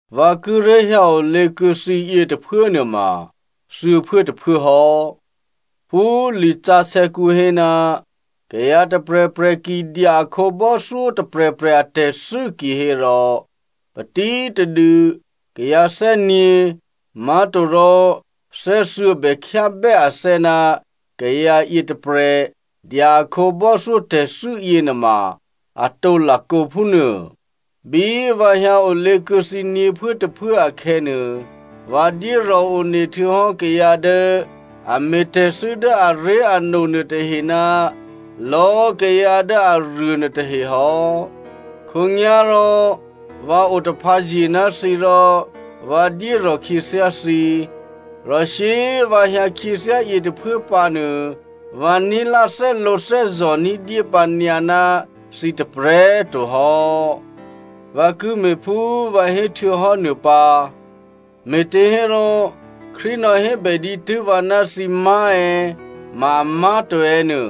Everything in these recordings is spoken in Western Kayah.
Vǎ kíré̤ hyǎ olě kuô̌ thǐ yětôphuố nuôma thuô̌phuốtôphuố hò́. Phú lisǎsè̌kǔ hé, “Kayǎ tôprè̤prè̤ ki dya a khǒbò́thyó tôprè̤prè̤ atè̤thû́ kihérò, patítadû kayǎ thè́gně má̤torò thè́thuô̌ bè khyábè́ athè́ ná kayǎ yětôprè̤ dya a khǒbò́thyó tè̤thû́ yěnuôma atǒ lakǒ phúnuô.” Bí vǎ hyǎ olě kuô̌ thǐ nyě̤phuốtôphuố akhè̌nuô, vǎ dyérò̤ one htuô̌hò́ kayǎ dố a me̤thû́tè̤ dố aré̤ano nuôtahe ná lò̌꤮ kayǎ dố aruô nuôtahe hò́. Khǒnyá̤rò vǎ otaphǎzye ná thǐ rò vǎ dyérò̤ khyěthyá thǐ. Rò shyé꤮ vǎ hyǎ khyěthyá yětôphuố pǎnuô vǎ ní̤lá thè́lǒthè́zò̤ ní̤dyé pǎnyǎ ná thǐ tôprè̤꤮ to hò́. Vǎ ki me̤ phú vǎ héhtuô̌hò́ nuô pǎ, me̤těhérò Krístu nò̌hébè dǐtû́ vǎ ná thǐ má̤ è̌ ma amá̤to è̌ nuô,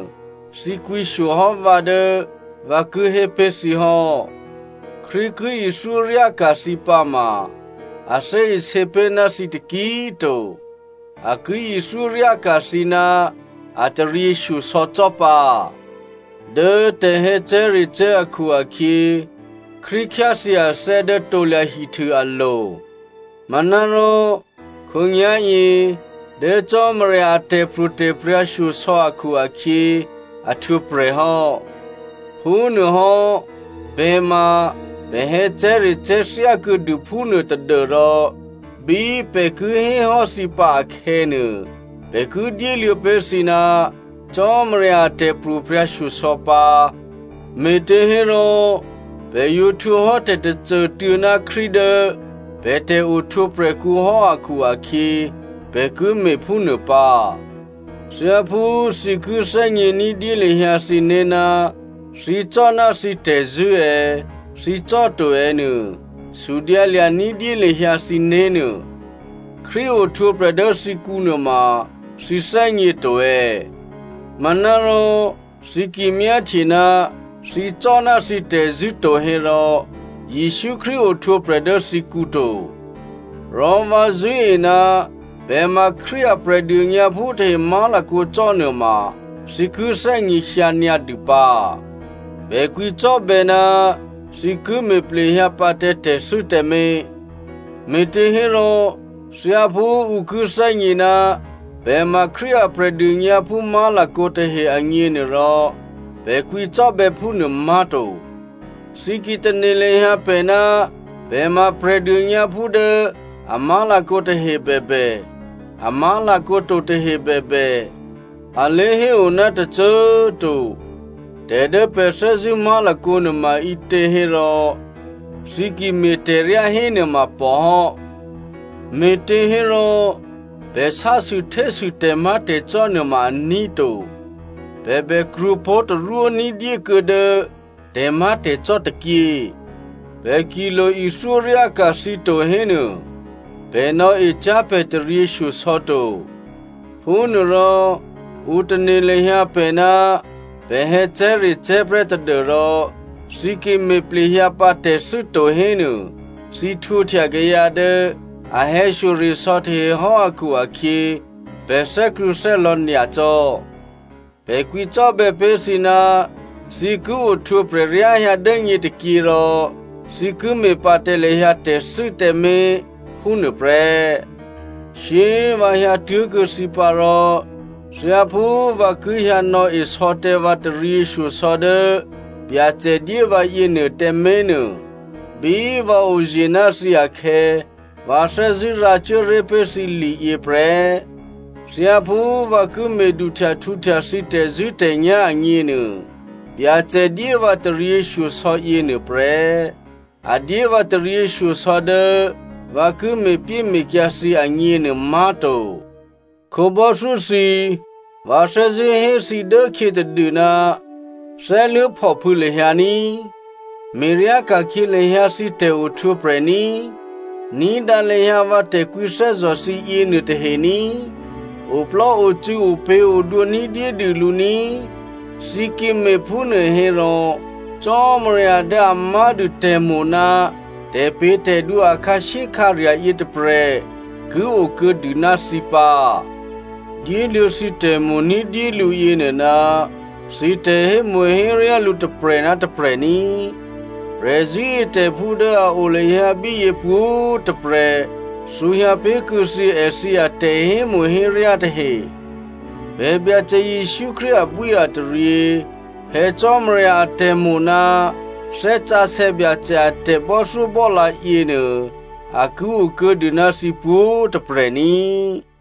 thǐ kwǐshyo hò́ vǎ dố vǎ ki hé pé̤ thǐ hò́. Krístu ki ithyóryáka̤ thǐ pǎma, a thè́isě pé̤ ná thǐ taki꤮ to, a ki ithyóryáka̤ thǐ ná a taryěshyosò̌ cò́ pǎ. Dố tè̤hè̌cè̤́recè̤́ akhu-akhyě Krístu khyáthyě athè́ dố krusu alo̤. Manárò khǒnyá̤yě dố Cò́marya a tè̤pro̤tè̤prya̤ shyosò̌ akhu-akhyě a htwǒprè̤ hò́. Phúnuôhò́ pè̤ ma pè̤ hè̌cè̤́recè̤́ thyákuô̌dû phúnuô tadû́rò bí pè̤ ki hé hò́ thǐ pǎ akhè̌nuô, pè̤ ki dyéluô̌ pé̤ thǐ ná Cò́marya a tè̤pro̤prya̤ shyosò̌ pǎ, me̤těhérò pè̤ yǒ htwǒ hò́ tè̤tôcô꤮ tuô̌ ná Krístu dố pè̤ tè̤ohtwǒprè̤kǔ hò́ akhu-akhyě, pè̤ ki me̤phúnuô pǎ. Thyáphú thǐ ki thè́gně ní̤dyé lahyǎ thǐné̤ ná thǐ cò́ ná thǐ tè̤zṳ̂́ è̌, thǐ cò́ to è̌ nuô, sudyǎ lya̤ ní̤dyé lahyǎ thǐné̤ nuô. Krístu ohtwǒprè̤ dố thǐkǔ nuôma thǐ thè́gně to è̌? Manárò thǐ ki myáhtye ná thǐ cò́ ná thǐ tè̤zṳ̂́ to hérò, Jesǔ Krístu ohtwǒprè̤ dố thǐkǔ to. Rò vǎ zṳ̂́e ná pè̤ ma Krístu a Prè̤dônyǎphú tahe má̤lakǒ cò́ nuôma, thǐ ki thè́gněhyǎ nyǎdû pǎ. Pè̤ kwǐcò́bè̌ ná thǐ ki me̤ plehyǎ pǎ tǎ tè̤thû́ tǎmé̤, me̤těhérò thyáphú ǔ ki thè́gně ná pè̤ ma Krístu a Prè̤dônyǎphú má̤lakǒ tahe agněnuôrò, pè̤ kwǐcò́bè̌ phúnuô má̤to. Thǐ ki tane̤ lahyǎ pè̤ ná pè̤ ma Prè̤dônyǎphú dố a má̤lakǒ tahe bèbè, a má̤lakǒ to tahe bèbè, a lé̤héo ná tôcô꤮ to, tè̤ dố pè̤ thè́zṳ̂́ má̤lakǒ nuôma ǐtě hérò thǐ ki me̤tè̤ryá hénuôma pò hò́. Me̤těhérò pè̤ sásûhtésû tè̤má̤tè̤cò́ nuôma aní̤ to, pè̤ bèkrwǒ pó̤ tarwó ní̤dyékuô̌ dố tè̤má̤tè̤cò́ tôkyě. Pè̤ ki lo ithyóryáka̤ thǐ to hénuô, pè̤ nò̌ecyá̤ pè̤ taryěshyosò̌ to, phúnuôrò ǔ tane̤ lahyǎ pè̤ ná pè̤ hè̌cè̤́recè̤́ prè́ tadû́rò thǐ ki me̤ plehyǎ pǎ tè̤thû́ to hénuô, thǐ htwǒhtya kayǎ dố a hè̌shyoresò̌ tahe hò́ akhu-akhyě pè̤ thè́krṳ̂̌thè́lò̌ nyacò́. Pè̤ kwǐcò́bè̌ pé̤ thǐ ná thǐ ki ohtwǒprè̤ ryáhyǎ dố nyě tôkyě rò thǐ ki me̤ pǎ tǎ lahyǎ tè̤thû́ tǎmé̤, phúnuô prè́. Shyé꤮ vǎ hyǎtuố̤kuô̌ thǐ pǎ rò thyáphú vǎ ki hyǎ nò̌e sò̌ tǎ vǎ taryěshyosò̌ dố Byacè dyé vǎ yěnuô tǎmé̤nuô, bí vǎ oye̤ ná thǐ akhè̌, vǎ thè́zṳ̂́ rǎcuố ré̤ pé̤ thǐ liyě prè́. Thyáphú vǎ ki me̤duhtyahtǔhtya thǐ tè̤zṳ̂́tè̤nyá̤ agněnuô, Byacè dyé vǎ taryěshyosò̌ yěnuô prè́. A dyé vǎ taryěshyosò̌ dố vǎ ki me̤pyéme̤kyǎ thǐ agněnuô má̤to. Khǒbò́thyó thǐ꤮, vǎ thè́zṳ̂́ hé thǐ dố khyětadû, thè́luố̤phòphû̌ lahyǎ ní꤮. Me̤ryáka̤khyě lahyǎ thǐ tè̤ohtwǒprè̤ ní꤮. Ní̤dǎ lahyǎ vǎ tè̤kwǐthè́zò̤ thǐ yěnuô tahe ní꤮. Oplò́ocû̌, opě̤odwǒ ní̤dyédû lǔ ní꤮. Thǐ ki me̤phúnuô hérò Cò́marya dố a má̤dû tè̤mo̤ ná tè̤pě̤tè̤dwǒ a khǎshyékhǎrya̤ yětôprè̤ ki o kuô̌dû ná thǐ pǎ. Dyéluô̌ thǐ tè̤mo̤ ní̤dyélǔ yěnuô ná thǐ tè̤hémo̤héryá lǔ tôprè̤ ná tôprè̤ ní꤮. Prè̤zṳ̂́etè̤phú dố a o lahyǎ bíyě pwǒ̤꤮ tôprè̤ thǔhyǎ pé̤ kuô̌ thǐ èthǐ atè̤hémo̤héryá tahe. Pè̤ Byacè Jesǔ Krístu abwíataryě, Phè̌ Cò́marya atè̤mo̤ ná Thè́ Sǎsè̌ Byacè a tè̤bò́thyóbò́lǎ yěnuô, a ki o kuô̌ dû ná thǐ pwǒ̤꤮ tôprè̤ ní꤮.